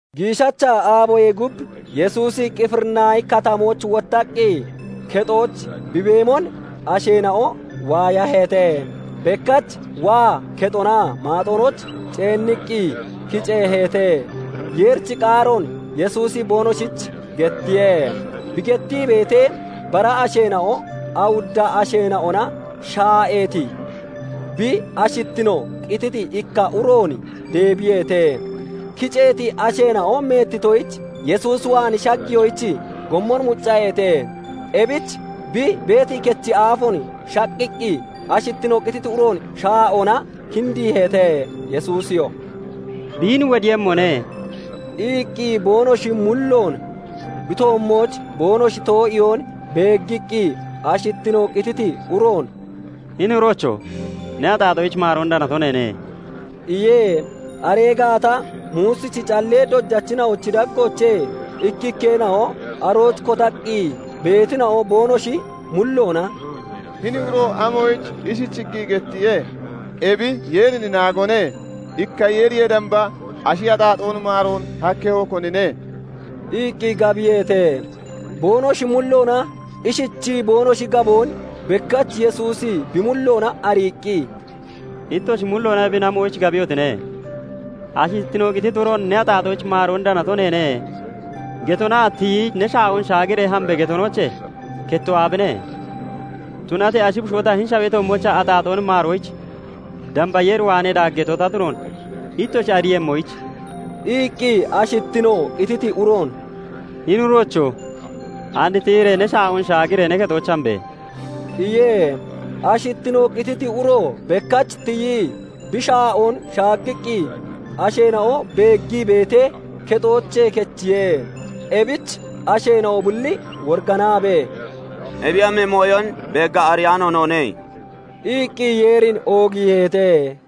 Giishacha aaboyee gub Yesuusi Qifirinaahi katamooch wottaqqi kexooch bi beemon asheena'o waayaheete. Bekkach waa, kexonaa maaxonooch ceenniqqi kiceeheete; Yeerichi qaaroon Yesuusi boonoshich gettiye. Bi gettii beetee, bara asheena'o awudda asheena'ona shaa'eeti, bi ashittino qititi ikka uroon deebiyeete. Kiceeti asheena'o meettitoyich Yesuus waan shagiyoyich gommon muccaheete. Ebich bi beeti kechi aafoon shaqqiqqi ashittino qititi uroon shaa'oona kindiiheete. Yesuusiyoo "Biin wodiiyemmone" iqqi boonoshi mulloon bi toommooch boonoshi too'iyoon beeggiqqi, ashittino qititi uroon "Hini uroocho! Ne axaaxoyich maaroon danato neene" iye. Aree gaata Muusichi callee dojachina'ochi daggoochee ikkikkeena'o arooch kotaqqi beetina'o boonoshi mulloona "Hini uro amoyich ishichiqqi gettiye? Ebi Yeerin naagone. Ikka Yeeriyee damba ashi axaaxoon maaroon hakkemmo konine?" iqqi gabiyeete. Boonoshi mulloona ishichii boonoshi gaboon bekkach Yesuusi bi mulloona ariiqqi, "Ittoshi mulloona ebin amoyich gabiyotine? Ashittino qititi uroon 'Ne axaaxoyich maaroon danato neene' getonaa 'Tiyi ne shaa'oon shaagiree hambe!' getonoochee kettoo aabine? Tunatee ashi bushoo ta hini shawee toommoochaa axaaxoon maaroyich damba Yeer waanee daaggeeto ta tunoon ittoshi ariiyemmoyich..." iqqi, ashittino qititi uroon "Hini uroocho! And tiyiree ne shaa'oon shaagiree ne kexooch hambe!" iye. Ashittino qititi uro bekkach tiyii bi shaa'oon shaaggiqqi asheena'o beeggii beetee, kexoochee kechiye. Ebich asheena'o bulli woriganaabee, "Ebiyoomi mooyon beeggaa ariyaano noone" iqqi Yeerin oogiiheete.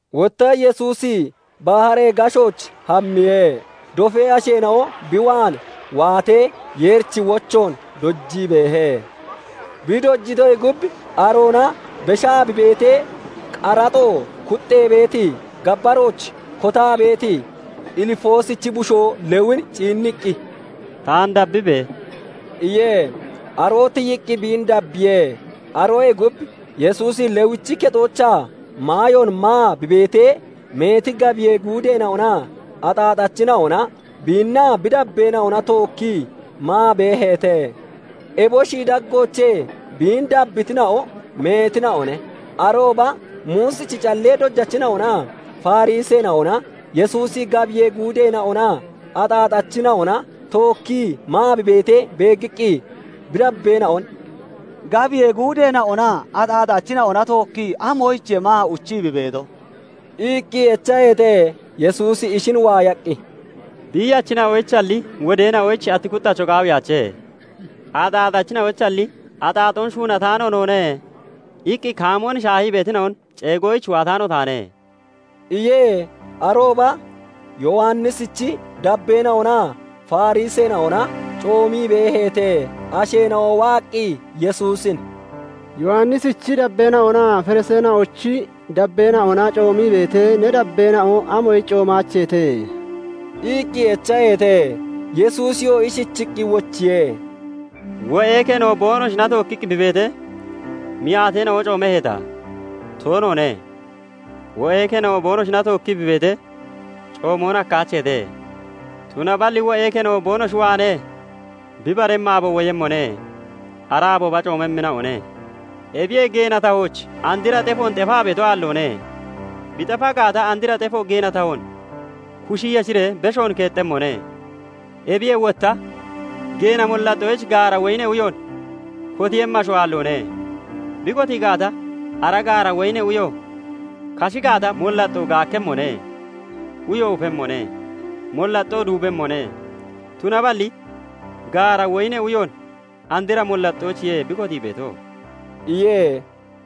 Wotta Yesuusi baharee gashooch hammiye. Dofee asheena'o bi waan waatee, Yeerichi wochoon dojii beehe. Bi dojitoyee gub aroona beshaa bi beetee, qaraxo kuxee beeti gabbarooch kotaa beeti Ilfoosichi bushoo Lewin ciinniqqi, "Taan dabbibe!" iye. Aroo tiyiqqi biin dabbiye. Aroyee gub Yesuusi Lewichi kexoochaa maayoon maa bi beetee, meeti gabiyee guudeena'onaa axaaxachina'ona biinnaa bi dabbeena'ona tookkii maa beeheete; eboshi daggoochee biin dabbitina'o meetina'one. Arooba Muusichi callee dojachina'onaa Fariseena'ona Yesuusi gabiyee guudeena'onaa axaaxachina'ona tookkii maa bi beetee beeggiqqi, bi dabbeena'on "Gabiyee guudeena'onaa axaaxachina'ona tookkii amoyichiye maa uchii bi beeto" iqqi echaheete. Yesuusi ishin waayaqqi, "Biiyachina'oyichalli wodeena'oyich ati kuxxacho qaawiyaache; axaaxachina'onalli 'Axaaxoon shuunataano noone' iqqi kaamoon shaahii beetina'on ceegoyich waataano taane" iye. Arooba Yowannisichi dabbeena'onaa Fariseena'ona coomii beeheete. Asheena'o waaqqi Yesuusin "Yowannisichi dabbeena'onaa Fariseena'ochi dabbeena'ona coomii beetee, ne dabbeena'o amoyich coomaacheete?" iqqi echaheete. Yesuusiyoo ishichiqqi wochiye:- "Wo'ee keno boonoshina tookkiqqi bi beetee, miyaateena'o coomeheeta? Toonoone. Wo'ee keno boonoshina tookkii bi beetee, coomoon hakkaacheete. Tunaballi wo'ee keno boonoshi waanee bi baremmi aabo woyemmone; ara aabooba coomemmina'one. "Ebiyee geena tahooch andra xefoon xefaa beeto aalloone; bi xefa gaata, andra xefo geena tahoon kushi yeshiree beshoon keexemmone. Ebiyee wotta geena mollaxxooch gaara woyinee uyoon kotiiyemmi asho aalloone; bi kotii gaata, ara gaara woyinee uyo kashi gaata, mollaxxoon gaakkemmone; uyoo ufemmone; mollaxxoo duubemmone; tunaballi gaara woyinee uyoon andra mollaxxoochiye bi kotii beeto" iye.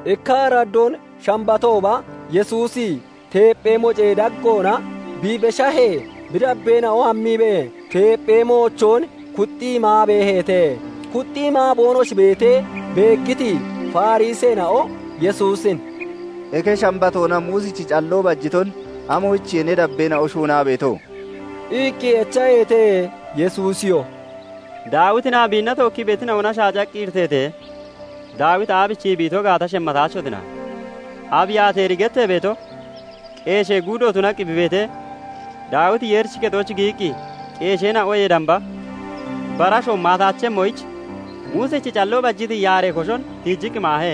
Ikka araddoon Shambatooba Yesuusi teepphee moocee daggoona bi beshahee, bi dabbeena'o hammiibee teepphee moochoon kuxii maa beeheete. Kuxxii maa boonoshi beetee beeggiti Fariseena'o Yesuusin "Eke Shambatoona Muusichi calloo bajiton amoyichiye ne dabbeena'o shuunaa beeto?" iqqi echaheete. Yesuusiyoo "Daawitinaa biinna tookkii beetina'ona shaacaqqi iriteetee, Daawiti aabichii bi ito gaata shemmataachotina Abiyaateeri gettee beeto qeeshee guudo tunaqqi bi beetee, Daawiti Yeerichi kexooch giyiqqi, qeesheena'oyee damba bara asho maataachemmoyich Muusichi calloo bajiti yaaree koshon tiijiqqi maahe;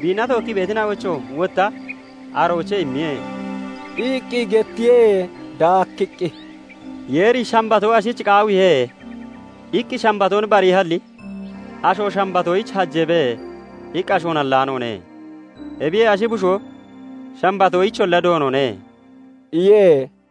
biinna tookkii beetina'oyichoo wotta aroochee immiye" iqqi gettiye. Daakkiqqi, "Yeeri 'Shambatoo ashich qaawiihe' iqqi Shambatoon bariihalli, 'Asho Shambatoyich hajeebe' iqqi ashoon hallaanoone. Ebiyee Ashi bushoo Shambatoyicholla Doonone" iye.